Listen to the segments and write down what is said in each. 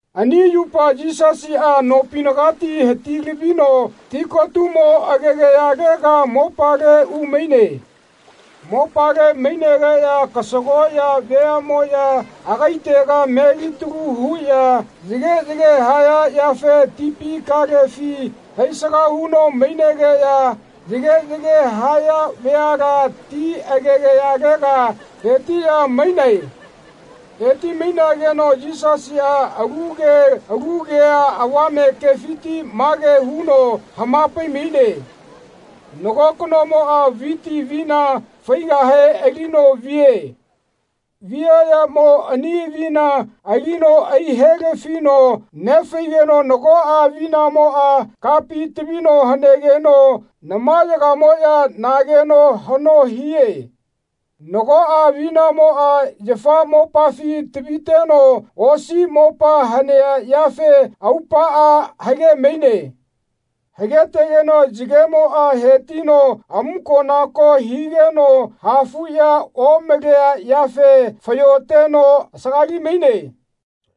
Ani yupa Yisasiꞌa nopinagati hati-lavino tikotumo agegayalega mopale umaine. Mopale mainegeꞌya kasagoꞌya veaꞌmoꞌya agaitega melitalu huꞌya yageꞌyage haya yafe tipi kalefi hai-saga huno mainegeꞌya yageꞌyage haya veala ti agegayalega hetiꞌya mainae. Heti-mainageno Yisasiꞌa alu ke alu kea avame kefiti mage huno hama-pai-maine. “Nago kanomoꞌa viti avina faigahe alino vie. Viaꞌyamo ani avina alino ai-he-lafino nefaigeno nagoꞌa avinamoꞌa kapi tavino hanegeno namayagamoꞌya nageno haꞌno hie. Nagoꞌa avinamoꞌa yafa mopafi taviteno osi mopa hanea yafe aupaꞌa hage-maine. Hagetegeno yagemoꞌa hetino amuko-nako higeno hafuꞌya omalea yafe fayoteno asagali-maine.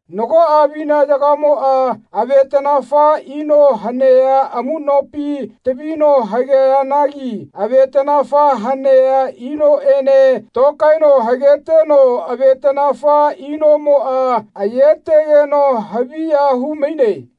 Nagoꞌa avinayagamoꞌa avetaꞌnafa ino hanea amuꞌnopi tavino hageanagi avetaꞌnafa hanea inoꞌene tokaeno hageteno avetaꞌnafa inomoꞌa ayetegeno haviya hu-maine.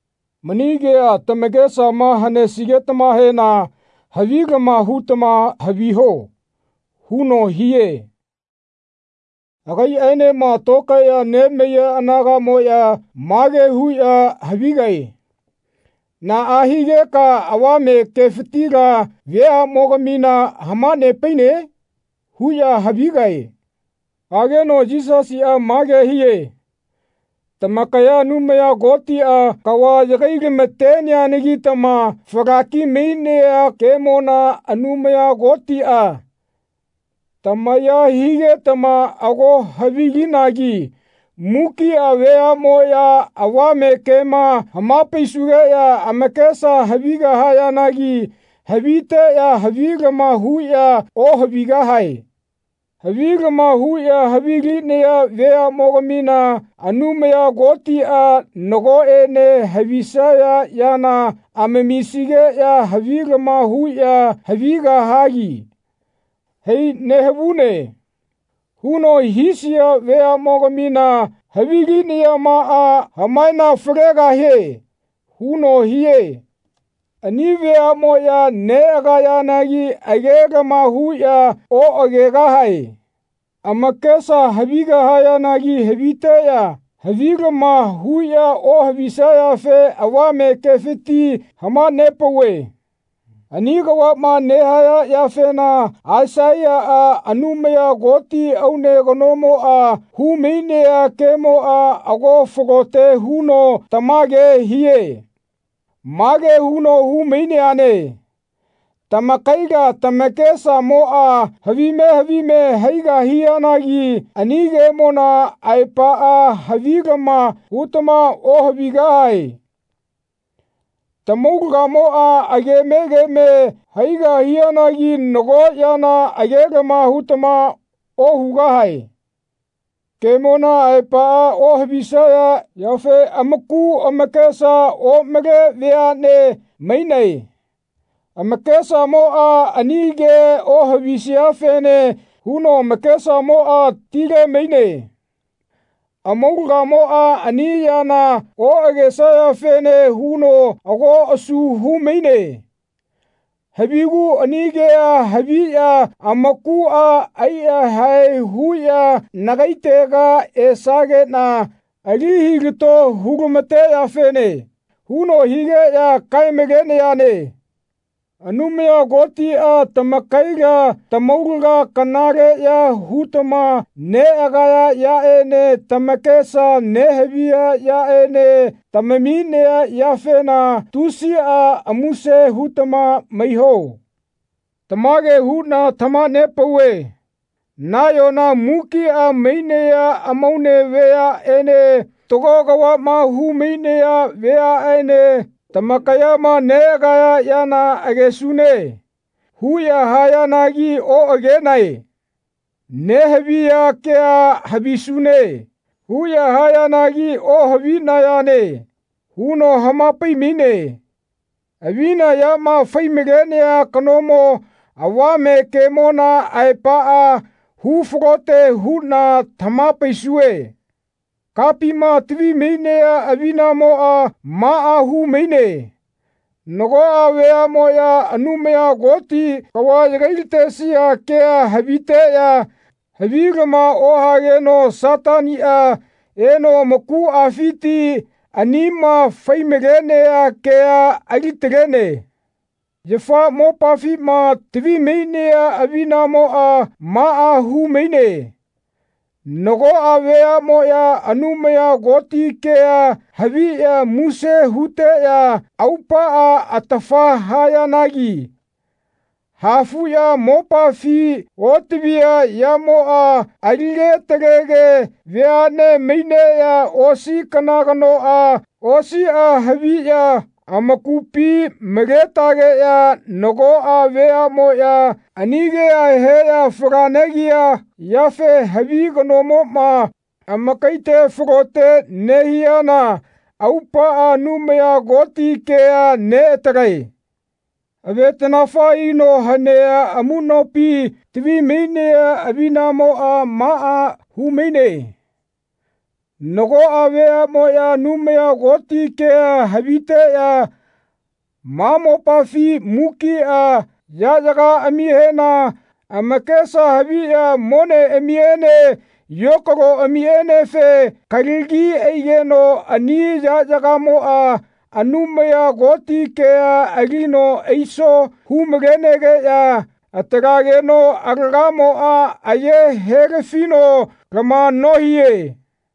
Mani kea tamakesama hanesigetamahena havilama hutama haviho.” huno hie. Agaiꞌaenema tokaeꞌya nemaiya anagaꞌmoꞌya mage huꞌya havigae “Naꞌa higeka avame kefitila veaꞌmogamina hama-nepaine?” huꞌya havigae. Hageno Yisasiꞌa mage hie “Tamakaya Anumaya Kotiꞌa kava yagai-lama-teneanagitama falaki mainea kemona Anumaya Kotiꞌa tamaya higetama ago havi-linagi mukiꞌa veaꞌmoꞌya avame kema hama-paisugeꞌya amakesa havigahayanagi haviteꞌya havilama huꞌya ohavigahae. Havilama huꞌya havilinaya veaꞌmogamina Anumaya Kotiꞌa nagoꞌene havisaya yana amamisigeꞌya havilama huꞌya havigahagi ‘Hai nehavune.’ huno hisaya veaꞌmogamina havilinayamaꞌa hamanafalegahie.” huno hie. Ani veaꞌmoꞌya neꞌagayanagi agelama huꞌya oꞌagegahae. Amakesa havigahayanagi haviteꞌya havilama huꞌya ohavisayafe avame kefiti hama-nepauve. Ani kavaꞌma nehaya yafena Aisaiyaꞌa Anumaya Koti aune kanomoꞌa hu-mainea kemoꞌa ago falote huno tamage hie. Mage huno hu-maineane “Tamakaila tamakesamoꞌa havime havime haigahianagi ani kemona aepaꞌa havilama hutama ohavigahae. Tamaulagamoꞌa ageme geme haigahianagi nago yana agelama hutama ohugahae. Kemona aepaꞌa ohavisaya yafe amaku amakesa omale veaꞌne mainae. Amakesamoꞌa ani ke ohavisiafene huno amakesamoꞌa tile-maine. Amaulagamoꞌa ani yana oꞌagesayafene huno ago asu hu-maine. Havigu ani kea haviꞌya amakuꞌa ai-yahae huꞌya nagaitega esageꞌna ali hilato hu-lama-teyafene.” huno higeꞌya kae-malenayane. Anumaya Kotiꞌa tamakaila tamaulaga kanaleꞌya hutama neꞌagaya yaꞌene tamakesama nehaviya yaꞌene tamaminea yafena tusiꞌa muse hutama maiho. Tamage huꞌna tamaha-nepauve “Nayona mukiꞌa mainaya amaune vayaꞌene fatago kavaꞌma hu-mainaya vayaꞌene tamakayama neꞌagaya yana ‘Agesune.’ huꞌya hayanagi oꞌagenae. Nehaviya kea ‘Havisune.’ huꞌya hayanagi ohavinayane.” huno hama-pai-maine. “Avina yama fai-malenea kanomo avame kemona aepaꞌa hu-falote huꞌna tamaha-paisue. Kapima tavi-mainea avinamoꞌa maꞌa hu-maine nagoꞌa veaꞌmoꞌya Anumaya Koti kava yagai-latesia kea haviteꞌya havilama ohageno Sataniꞌa eno amakuꞌafiti anima fai-malenea kea ali-talene. Yafa mopafima tavi-mainea avinamoꞌa maꞌa hu-maine nagoꞌa veaꞌmoꞌya Anumaya Koti kea haviꞌya muse huteꞌya aupaꞌa atafa hayanagi hafuꞌya mopafi otavia yamoꞌa alige atalege veaꞌne maineꞌya osi kana kanoꞌa osiꞌa haviꞌya amakupi maletageꞌya nagoꞌa veaꞌmoꞌya ani kea heꞌya fala-negiya yafe havi kanamoꞌma amakaite falote nehiana aupaꞌa Anumaya Koti kea neꞌatalae. Avetaꞌnafa ino hanea amuꞌnopima tavi-mainea avinamoꞌa maꞌa hu-maine nagoꞌa veaꞌmoꞌya Anumaya Koti kea haviteꞌya ma mopafi mukiꞌa yaꞌyagaꞌamihena amakesa haviꞌya moneꞌamiene yokaloꞌamienefe kalagi aigeno ani yaꞌyagamoꞌa Anumaya Koti kea alino aiso hu-malegeꞌya atalageno alagamoꞌa aye he-lafino lama nohie.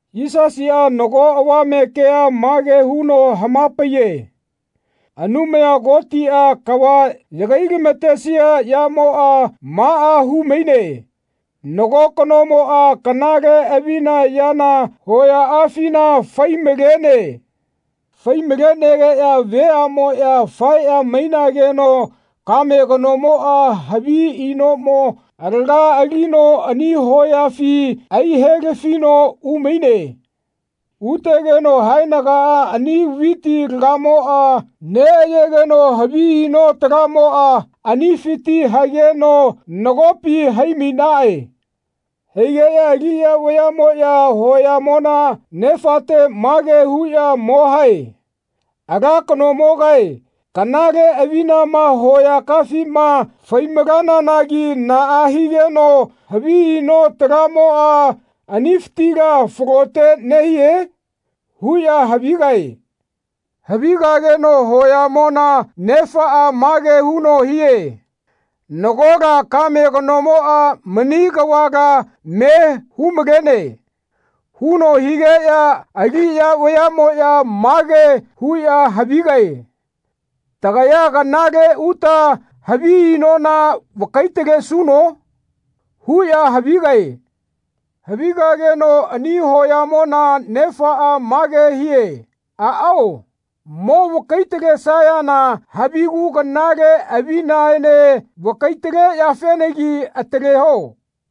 Yisasiꞌa nago avame kea mage huno hama-paiye. Anumaya Kotiꞌa kava yagai-lama-tesia yamoꞌa maꞌa hu-maine nago kanomoꞌa kanale avina yana hoyaꞌafina fai-malene. Fai-malenegeꞌya veaꞌmoꞌya faeꞌya mainageno kame kanomoꞌa havi inoꞌmo alaga alino ani hoyafi ai-he-lafino umaine. Utegeno haenaga ani viti alagamoꞌa neꞌayegeno havi ino talamoꞌa anifiti hageno nagopi hai-mainaꞌe. Haigeꞌya aliꞌya vayaꞌmoꞌya hoyamona nefate mage huꞌya mo hae “Ala kanomogae kanale avinama hoyakaꞌafima fai-malananagi naꞌa higeno havi ino talamoꞌa anifitila falote nehie?” huꞌya havigae. Havigageno hoyamona nefaꞌa mage huno hie “Nagola kame kanomo mani kavala me hu-malene.” huno higeꞌya aliꞌya vayaꞌmoꞌya mage huꞌya havigae “Tagaya kanale uta havi inona vakai-talesuno?” huꞌya havigae. Havigageno ani hoyamona nefaꞌa mage hie “Aꞌao, mo vakai-talesayana havigu kanale avinaene vakai-taleyafenagi ataleho.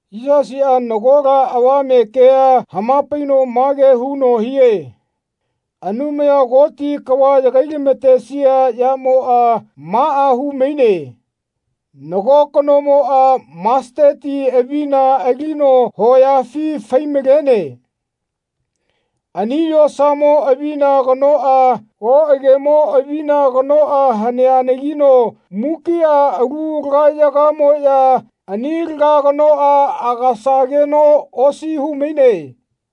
Yisasiꞌa nagola avame kea hama-paino mage huno hie “Anumaya Koti kava yagai-lamatesia yamoꞌa maꞌa hu-maine nago kanomoꞌa masatati avina alino hoyafi fai-malene. Ani yosamo avina kanoꞌa oꞌagemo avina kanoꞌa haneanagino mukiꞌa alu alagayagamoꞌya ani alaga kanoꞌa agasageno osi hu-maine.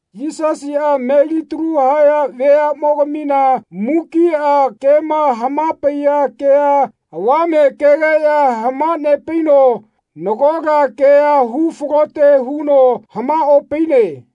Yisasiꞌa melitalu haya veaꞌmogamina mukiꞌa kema hama-paiya kea avame kegeꞌya hama-nepaino nagola kea hu-falote huno hamaꞌopaine.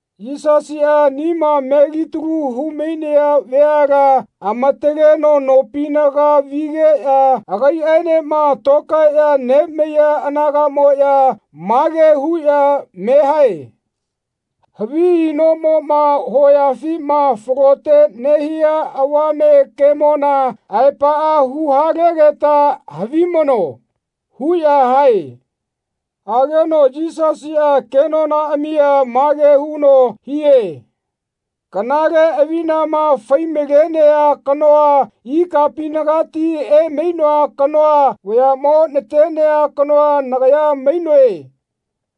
Yisasiꞌa anima melitalu hu-mainaya veala amataleno nopinaga vigeꞌya agaiꞌaenema tokaeꞌya nemaiya anagaꞌmoꞌya mage huꞌya me hae “Havi inomoꞌma hoyafima falote nehia avame kemona aepaꞌa hu-halegeta havimano.” huꞌya hae. Hageno Yisasiꞌa kenonaꞌamia mage huno hie “Kanale avinama fai-malenea kanoa ikapinagati emainoa kanoa vayaꞌmo natenea kanoa nagaya mainoe.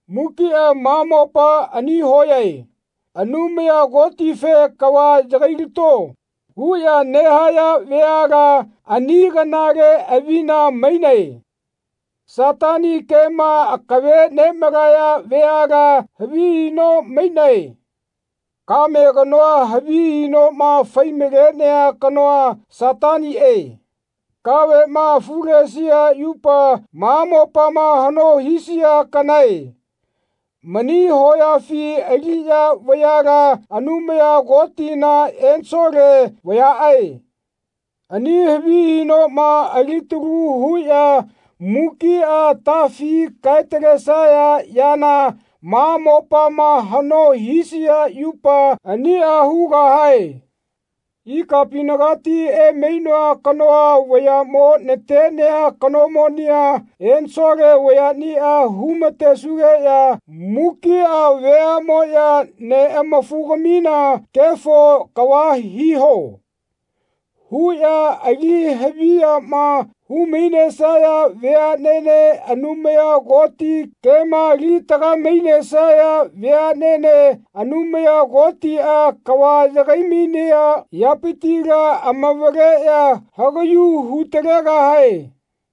Mukiꞌa ma mopa ani hoyae. Anumaya Kotife ‘Kava yagai-lato.’ huꞌya nehaya veala ani kanale avina mainae. Satani kema akave nemalaya veala havi ino mainae. Kame kanoa havi inoma fai-malenea kanoa Sataniꞌe. Kaveꞌma afulesia yupa ma mopama haꞌno hisia kanae. Mani hoyafi aliꞌya vayala Anumaya Kotina ensole vayaꞌae. Ani havi inoma alitalu huꞌya mukiꞌa atafi kae-talesaya yana ma mopama haꞌno hisia yupa aniꞌa hugahae. Ikapinagati emainoa kanoa vayaꞌmo natena kanomonia ensole vayaꞌnia hu-ma-tesugeꞌya mukiꞌa veaꞌmoꞌya neꞌamafugamina ‘Kefo kava hiho.’ huꞌya ali haviyama hu-mainesaya veaꞌnene Anumaya Koti kema ali-tagae-mainesaya veaꞌnene Anumaya Kotiꞌa kava yagai-mainea yapitila amavaleꞌya hagaꞌyu hu-talegahae.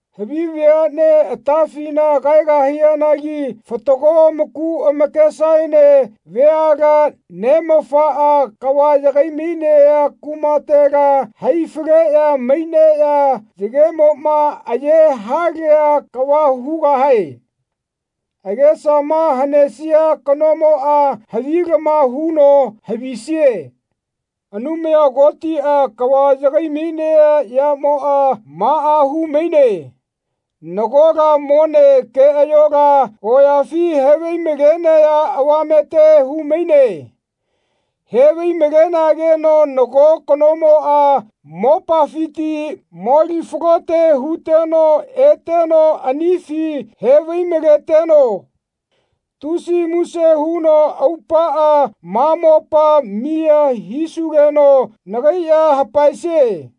Havi veaꞌnea atafina kaegahayanagi fatago amaku amakesaene veala Neꞌamafaꞌa kava yagai-mainea kumatela hai-faleꞌya maineꞌya yagemoꞌma aye halea kava hugahae. Agesama hanesia kanomoꞌa havilama huno havisie.” Anumaya Kotiꞌa kava yagai-mainea yamoꞌa maꞌa hu-maine nagola mone keꞌayola hoyafi he-vai-malenaya avamete hu-maine. He-vai-malenegeno nago kanomoꞌa mopafiti moli-falote huteno eteno anifi he-vai-maleteno tusi muse huno aupaꞌa “Ma mopa miya hisugeno nagai ya hapaesie.”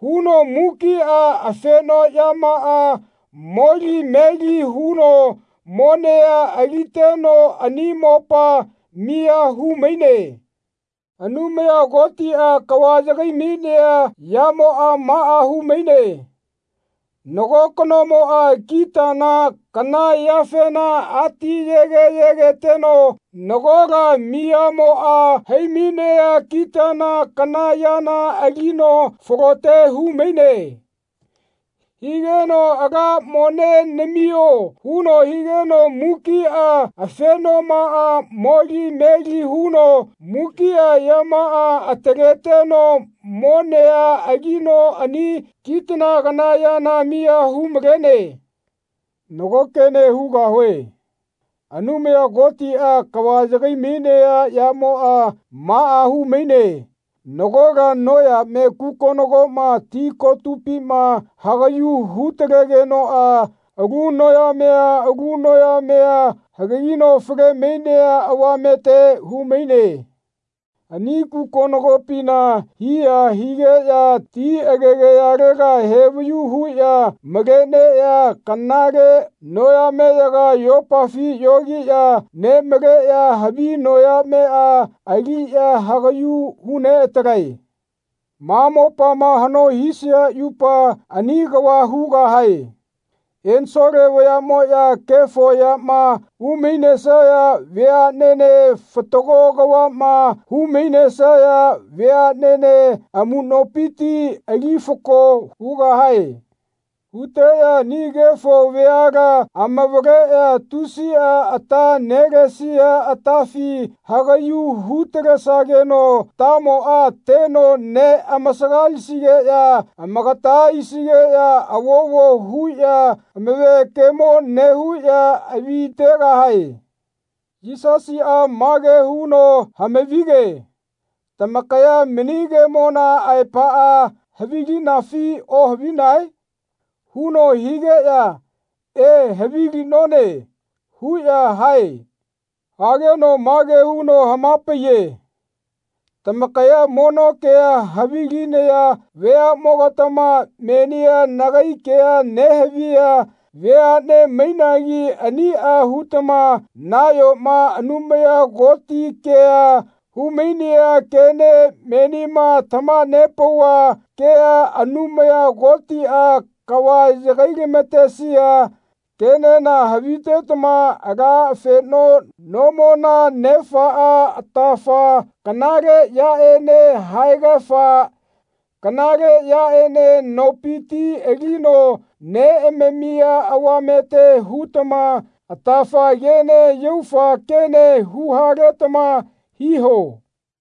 huno mukiꞌa afenoꞌyamaꞌa moli meli huno monea aliteno ani mopa miya hu-maine. Anumaya Kotiꞌa kava yagai-mainea yamoꞌa maꞌa hu-maine. Nago kanomoꞌa kitana kana yafena atiyege yegeteno nagola miyamoꞌa hai-mainea kitana kana yana alino falote hu-maine. Higeno “Ala mone namio.” huno higeno mukiꞌa afenomaꞌa moli meli huno mukiꞌa yamaꞌa ataleteno monea alino ani kitana kana yana miya hu-malene. Nago kene hugahue. Anumaya Kotiꞌa kava yagai-mainea yamoꞌa maꞌa hu-maine nagola noyame kukonagoma ti kotupima hagaꞌyu hu-talegenoꞌa alu noyamea alu noyamea hagagino fale-mainea avamete hu-maine. Ani kukonagopina hiya higeꞌya ti agegayalega he-vayu huꞌya maleneꞌya kanale noyameyaga yopafi yogiꞌya nemaleꞌya havi noyameꞌa aliꞌya hagaꞌyu hu-neꞌatalae. Ma mopama haꞌno hisia yupa ani kava hugahae. Ensole vayaꞌmoꞌya kefo yama hu-mainesaya veaꞌnene fatago kavaꞌma hu-mainesaya veaꞌnene amuꞌnopiti ali fako hugahae. Huteꞌya ani kefo veala amavaleꞌya tusiꞌa ata nelesia atafi hagaꞌyu hu-talesageno atamoꞌa teno neꞌamasagalisigeꞌya amakata aisigeꞌya avovo huꞌya amave kemo nehuꞌya avitegahae. Yisasiꞌa mage huno hama-vige “Tamakaya mani kemona aepaꞌa havilinafi ohavinae?” huno higeꞌya “E, havilinone.” huꞌya hae. Hageno mage huno hama-paiye “Tamakaya mono kea havilinaya vayaꞌmogatama menia nagai kea nehaviya veaꞌne mainagi aniꞌa hutama nayoma Anumaya Koti kea hu-mainaya kene menima tamaha-nepauva kea Anumaya Kotiꞌa kava yagai-lama-tesia kenena havitetama ala afeno nomona nefaꞌa atafa kanale yaꞌene haegafa kanale yaꞌene nopiti alino neꞌamamia avamete hutama atafa kene yaufa kene hu-haletama hiho.”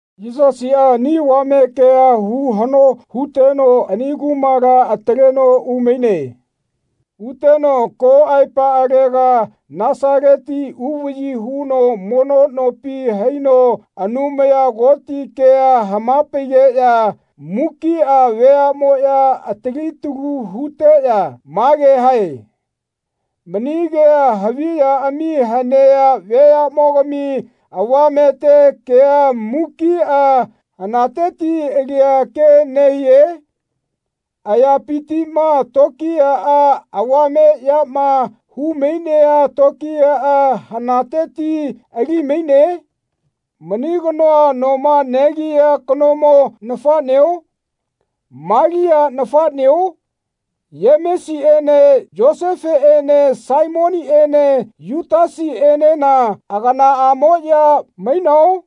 Yisasiꞌa ani avame kea hu-haꞌno huteno ani kumala ataleno umaine. Uteno ko aepaꞌalega Nasaleti uvaꞌyi huno mono nopi haino Anumaya Koti kea hama-paigeꞌya mukiꞌa veaꞌmoꞌya atali talu huteꞌya mage hae “Mani kea haviꞌyaꞌami hanea vayaꞌmogami avamete kea mukiꞌa hanateti alia ke nehie? Ayapitiꞌma tokiyaꞌa avame yama hu-mainea tokiyaꞌa hanateti ali-maine? Mani kanoa noma negia kanomo nafaꞌneo? Malia nafaꞌneo? Yemesiꞌene Yosefeꞌene Saimoniꞌene Yutasiꞌenena aganaꞌamoꞌya mainao?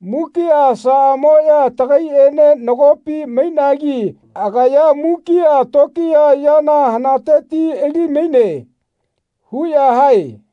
Mukiꞌa asaꞌamoꞌya tagaiꞌene nagopi mainagi agaya mukiꞌa tokiya yana hanateti ali-maine.” huꞌya hae.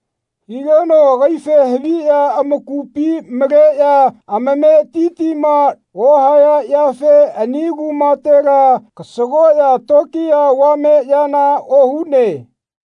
Higeno agaife haviꞌya amakupi maleꞌya amametitima ohaya yafe ani kumatela kasagoꞌya tokiya avame yana ohune.